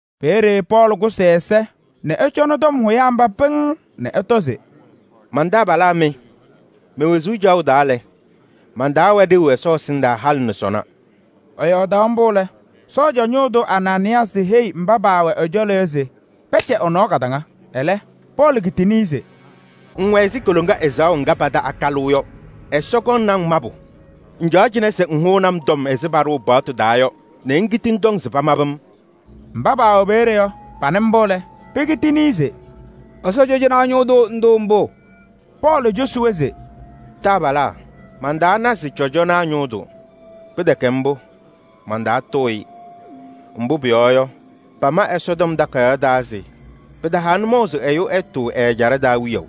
Peeye Pɔɔlɩ kʋsɩ ɛza nɛ ɛcɔnɩ tɔm hʋyaa mba pɩŋŋ nɛ ɛtɔ se: “Man-taabalaa mɩ! Me-wezuu caɣʋ taa lɛ, man-taa wɛ ɖeu Ɛsɔ ɛsɩndaa halɩ nɛ sɔnɔ.” Ɛyɔɔdaɣ mbʋ lɛ, cɔjɔnaa ñʋʋ tʋ Anaanɩyaasɩ heyi mba paawɛ ɛ-cɔlɔ yɔ se pɛcɛ ɛ-nɔɔ kadaŋa. Ɛlɛ Pɔɔlɩ kitini-i se: “Ŋwɛ ɛzɩ koloŋa ɛzaɣʋ ŋga pata akalʋʋ yɔ, Ɛsɔ kɔŋnɩ-ŋ mabʋ! Ŋcaɣ cɩnɛ se ŋhʋnɩ-m tɔm ɛzɩ paɖʋʋ paɣtʋ taa yɔ nɛ ŋkiti ŋtɔŋ se pamabɩ-m!” Mba paawɛ peeye yɔ, panɩ mbʋ lɛ, pekitini-i se: “Ɛsɔ cɔjɔnaa ñʋʋ tʋ ŋtʋʋ mbʋ?” Pɔɔlɩ cosi-wɛ se: “Taabalaa! Mantaana se cɔjɔnaa ñʋʋ tʋ. Pɩtɛkɛ mbʋ, mantaatʋʋ-ɩ. Mbʋ pʋyɔɔ yɔ, pama Ɛsɔtɔm Takayaɣ taa se: ‘Pɩtaha nʋmɔʋ se ɛyʋ ɛtʋʋ ɛ-ɛjaɖɛ taa wiyaʋ.’”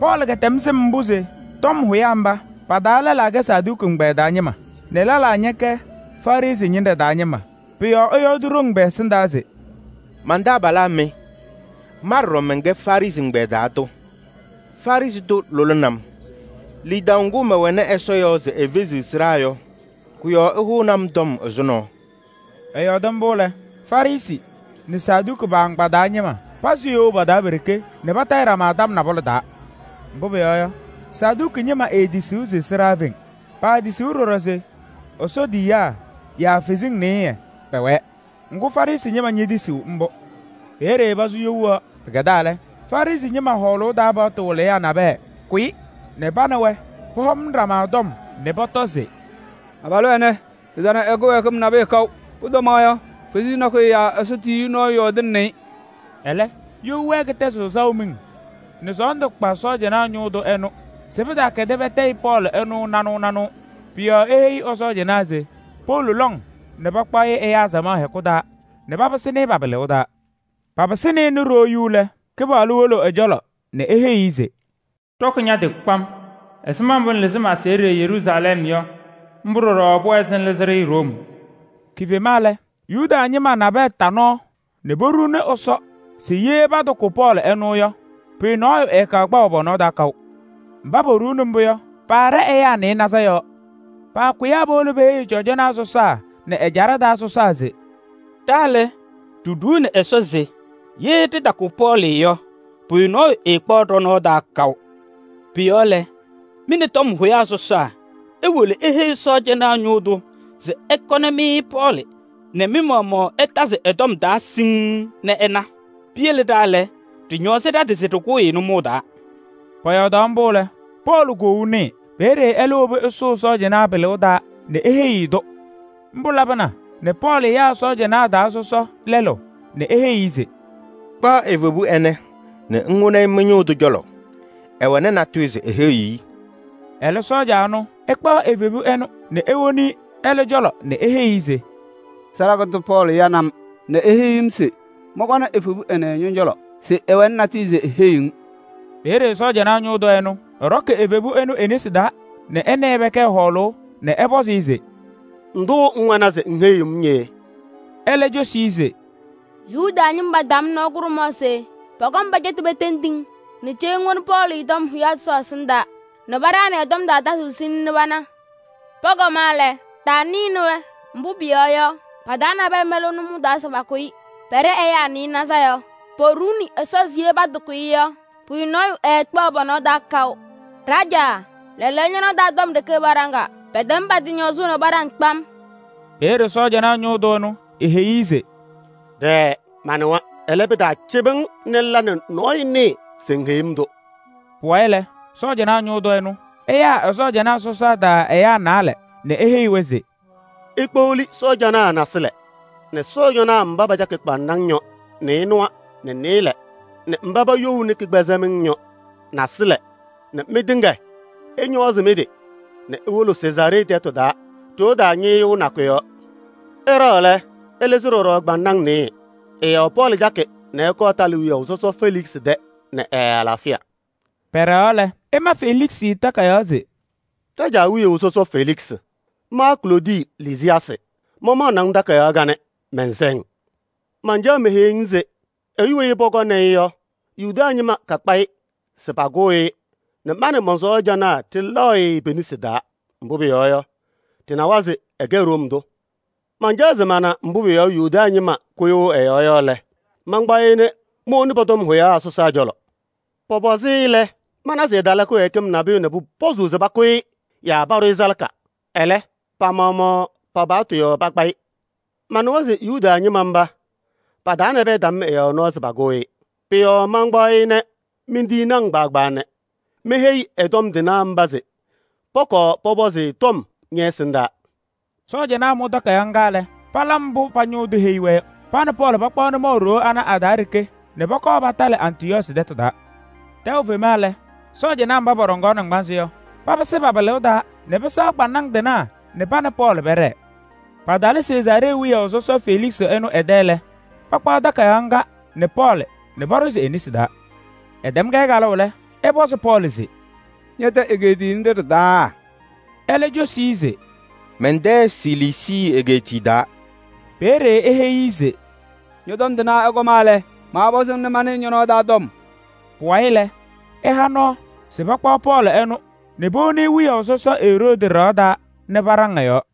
Pɔɔlɩ kɛtɛm sɩm mbʋ se tɔm hʋyaa mba, pa-taa lɛlaa Saduki ɛgbɛyɛ taa ñɩma nɛ lɛlaa Farɩsɩ ñɩnɖɛ taa ñɩma. Pʋ-yɔɔ ɛyɔɔdɩ ɖoŋ pɛ-ɛsɩndaa se: “Man-taabalaa mɩ! Ma ɖɔɖɔ mɛnkɛ Farɩsɩ ɛgbɛyɛ taa tʋ, Farɩsɩ tʋ lʋlɩnɩ-m. Lidaʋ ŋgʋ mɛwɛnɩ Ɛsɔ yɔɔ se efeziɣ sɩɖaa yɔ, kʋ-yɔɔ ɩhʋʋnɩ-m tɔm ɛzʋnɔ.” Ɛyɔɔdɩ mbʋ lɛ, Farɩsɩ nɛ Saduki pa-agbaa taa ñɩma pazɩ you pa-taa pe-ɖeke nɛ patayɩ ɖama hɔɔlʋʋ hɔɔlʋʋ. Mbʋ pʋyɔɔ yɔ, Saduki ñɩma eetisiɣ se sɩɖaa feŋ. Paatisiɣ ɖɔɖɔ se Ɛsɔ tiyiyaa yaa kalɩzasɩ nasɩyɩ pɛwɛɛ. Ŋgʋ, Farɩsɩ ñɩma ñetisiɣ mbʋ. Peeye pasʋ you yɔɔ. Pɩkɛdaa lɛ, Farɩsɩ ñɩma hɔɔlʋʋ taa paɣtʋ wɩlɩyaa nabɛyɛ kʋyɩ nɛ pa nɛ wɛ pɔhɔŋnɩ ɖama tɔm nɛ pɔtɔ se: “Abalʋ ɛnɛ, ɖɩtana ɛ-kɩwɛɛkɩm nabʋyʋ kaʋ. Pʋtɔmaɣ yɔ, kalɩzaɣ nakɛyɛ yaa Ɛsɔ tiyiyu nɔɔyʋ yɔɔdɩnɩnɩ-ɩ.” Ɛlɛ, you wɛɛ kɩtɛzɩɣ saʋ miŋ nɛ sɔɔndʋ kpa sɔɔjanaa ñʋʋ tʋ ɛnʋ se pɩtaakɛdɩ patayɩ Pɔɔlɩ ɛnʋ nanʋʋ nanʋʋ. Pʋ-yɔɔ eheyi ɛ-sɔɔjanaa se powolo lɔŋ nɛ pakpaɣ-ɩ ɛyaa samaɣ hɛkʋ taa nɛ papɩsɩnɩ-ɩ pa-pɩlʋʋ taa. Papɩsɩnɩ-ɩ nɛ ɖoo yu lɛ, Kɩpaɣlʋ wolo ɛ-cɔlɔ nɛ eheyi-i se: “Ɖɔkɩ ña-tɩ kpam! Ɛzɩma mbʋ ŋlɩzɩ ma-aseɣɖe Yeruusalɛm yɔ, mbʋ ɖɔɖɔ pʋwɛɛ se ŋlɩzɩ-ɖɩ Room.” Kifema lɛ, Yuda ñɩma nabɛyɛ ta nɔɔ nɛ poɖuuni Ɛsɔ se ye patakʋ Pɔɔlɩ ɛnʋ yɔ, pʋyʋ nɔɔyʋ ɛɛkpaɣ pɔ-nɔɔ taa kaʋ. Mba poɖuu mbʋ yɔ, paaɖɛ ɛyaa nɩɩnaza yɔɔ. Paakʋyaa powolo peheyi cɔjɔnaa sɔsaa nɛ ɛjaɖɛ taa sɔsaa se: “Ɖa lɛ, ɖiɖuuni Ɛsɔ se ye ɖɩtakʋ Pɔɔlɩ yɔ, pʋyʋ nɔɔyʋ ɛɛkpaɣ ɖɔ-nɔɔ taa kaʋ. Pʋ-yɔɔ lɛ, mɩ nɛ tɔm hʋyaa sɔsaa iwolo iheyi sɔɔjanaa ñʋʋ tʋ se ɛkɔnɩ-mɩ Pɔɔlɩ nɛ mɩ-maɣmaɣ ɩtazɩ ɛ-tɔm taa siŋŋ nɛ ɩna. Piyele ɖa lɛ, ɖɩñɔɔzɩ ɖa-tɩ se ɖɩkʋʋ-ɩ nʋmɔʋ taa.” Pɔyɔɔdaɣ mbʋ lɛ, Pɔɔlɩ koou nɩɩ. Peeye ɛlɛ wobi ɛsʋʋ sɔɔjanaa pɩlʋʋ taa nɛ eheyi-i-tʋ. Mbʋ labɩna nɛ Pɔɔlɩ yaa sɔɔjanaa taa sɔsɔ lɛlʋ nɛ eheyi-i se: “Kpaɣ evebu ɛnɛ nɛ ŋwoni-i mɩ-ñʋʋ tʋ cɔlɔ, ɛwɛnɩ natʋyʋ se eheyi-i.” Ɛlɛ sɔɔja ɛnʋ, ɛkpaɣ evebu ɛnʋ nɛ ewoni-i ɛlɛ cɔlɔ nɛ eheyi-i se: “Salaka tʋ Pɔɔlɩ yanɩ-m nɛ eheyi-m se mɔnkɔnɩ evebu ɛnɛ ñɔ-cɔlɔ se ɛwɛnɩ natʋyʋ se eheyiɣ-ŋ.” Peeye sɔɔjanaa ñʋʋ tʋ ɛnʋ, ɛɖɔkɩ evebu ɛnʋ e-nesi taa nɛ ɛ nɛ ɩ pɛkɛɛ hɔɔlʋʋ nɛ ɛpɔzɩ-ɩ se: “Ndʋ ŋwɛnɩ se ŋheyiɣ-m yee?” Ɛlɛ cosi-i se: “Yuda ñɩma tam nɔɔ kʋɖʋmaɣ se pɔkɔŋ pɛcɛtɩ petendi-ŋ nɛ cee ŋwoni Pɔɔlɩ tɔm hʋyaa sɔsaa ɛsɩndaa nɛ paɖaɣnɩ ɛ-tɔm taa tazʋʋ siŋŋ nɛ pana. Pɔkɔma lɛ, taanɩnɩ-wɛ, mbʋ pʋyɔɔ yɔ, pa-taa nabɛyɛ mɛlɩɣ nʋmɔʋ taa se pakʋ-ɩ. Pɛɖɛ ɛyaa nɩɩnaza yɔɔ. Poɖuuni Ɛsɔ se ye patakʋ-ɩ yɔ, pʋyʋ nɔɔyʋ ɛɛkpaɣ pɔ-nɔɔ taa kaʋ. Ɖajaa, lɛɛlɛɛyɔ ñɔ-nɔɔ taa tɔm ɖeke paɖaŋaa. Pɛtɛm pa-tɩ ñɔɔzʋʋ nɛ paɖaŋ kpam.” Peeye sɔɔjanaa ñʋʋ tʋ ɛnʋ eheyi-i se: “Ɖɛɛ! Manɩwa. Ɛlɛ, pɩtaacɩbɩ-ŋ nɛ ŋla nɛ nɔɔyʋ nɩɩ se ŋheyi-m-tʋ.” Pʋwayɩ lɛ, sɔɔjanaa ñʋʋ tʋ ɛnʋ, ɛyaa ɛ-sɔɔjanaa sɔsaa taa ɛyaa naalɛ nɛ eheyi-wɛ se: “Ikpeɣli sɔɔjanaa naasɩlɛ nɛ sɔɔjanaa mba pacakɩ kpaŋnaŋ yɔ nɩɩnʋwa nɛ nɩɩlɛ nɛ mba paba youni kɩkpɛzɛmɩŋ yɔ naasɩlɛ nɛ mɩtɩŋa ɩñɔɔzɩ mɩ-tɩ nɛ iwolo Sezaaree tɛtʋ taa ɖoo taa ñɩɣtʋ nakʋ yɔɔ. Ɩɖɛɣ lɛ, ɩlɩzɩ ɖɔɖɔ kpaŋnaŋ nɩɩyɩ. Ɩ-yɔɔ Pɔɔlɩ cakɩ nɛ ɛkɔɔ ɛtalɩ wiyaʋ sɔsɔ Feliksɩ tɛ nɛ ɛ-alaafɩya.” Pɛɖɛɣaɣ lɛ, ɛma Feliksɩ takayaɣ se: “Ɖajaa wiyaʋ sɔsɔ Feliksɩ! Ma Kloodi Lisiyaasɩ mamaɣnɩ-ŋ takayaɣ kanɛ, mɛnsɛ-ŋ! Mancaɣ meheyi-ŋ se ɛyʋ weyi pɔkɔŋnɩ-ŋ yɔ, Yuda ñɩma kakpa-ɩ se pakʋʋ-ɩ nɛ ma nɛ mɔn-sɔɔjanaa ɖɩlɛɣ-ɩ pe-nesi taa. Mbʋ pʋyɔɔ yɔ, ɖɩnɩwa se ɛkɛ Room tʋ. Mancaɣaɣ se mana mbʋ pʋ-yɔɔ Yuda ñɩma kʋyʋʋ ɛ-yɔɔ yɔ lɛ, mankpaɣ-ɩ nɛ mowoni pɔ-tɔm hʋyaa sɔsaa cɔlɔ. Pɔpɔzɩ-ɩ lɛ, mana se ɛtala kɩwɛɛkɩm nabʋyʋ nɛ pʋpɔzʋʋ se pakʋ-ɩ yaa paɖʋ-ɩ salaka. Ɛlɛ, pa-maɣmaɣ pa-paɣtʋ yɔɔ pakpa-ɩ. Manɩwa se Yuda ñɩma mba pa-taa nabɛyɛ tam ɛ-yɔɔ nɔɔ se pakʋʋ-ɩ. Pʋ-yɔɔ mantɩkpaɣ-ɩ nɛ mentiyini-ŋ nɛ meheyi ɛ-tɔm tɩnaa mba se pɔkɔɔ pɔpɔzɩ-ɩ tɔm ñɛ-ɛsɩndaa!” Sɔɔjanaa mʋ takayaɣ ŋga lɛ, pala mbʋ pa-ñʋʋ tʋ heyi-wɛ yɔ: pa nɛ Pɔɔlɩ pakpaɣ nʋmɔʋ ɖoo ana a-taa ɖeke nɛ pɔkɔɔ patalɩ Antipatrii tɛtʋ taa. Tɛʋ fema lɛ, sɔɔjanaa mba pɔɖɔŋaɣ naŋgbanzɩ yɔ, papɩsɩ pa-pɩlʋʋ taa nɛ pɩsɛɣ kpaŋnaŋ tɩnaa nɛ pa nɛ Pɔɔlɩ pɛɖɛɛ. Patalɩ Sezaaree wiyaʋ sɔsɔ Feliksɩ ɛnʋ ɛ-tɛ lɛ, pakpaɣ takayaɣ ŋga nɛ Pɔɔlɩ nɛ paɖʋzɩ e-nesi taa. Ɛtɛm-kɛ kalʋʋ lɛ, ɛpɔzɩ Pɔɔlɩ se: “Ñɛ-tɛ egeetiye nɖɩ ɖɩ-taa?” Ɛlɛ cosi-i se: “Mɛn-tɛ Siliisii egeetiye taa.” Peeye eheyi-i se: “Ñɔ-tɔm tɩnaa ɛkɔma lɛ, maapɔzɩ-ŋ nɛ manɩɩ ñɔ-nɔɔ taa tɔm.” Pʋwayɩ lɛ, ɛha nɔɔ se pakpaɣ Pɔɔlɩ ɛnʋ nɛ powoni-i wiyaʋ sɔsɔ Eroodi ɖɩɣa taa nɛ paɖaŋ ɛ-yɔɔ.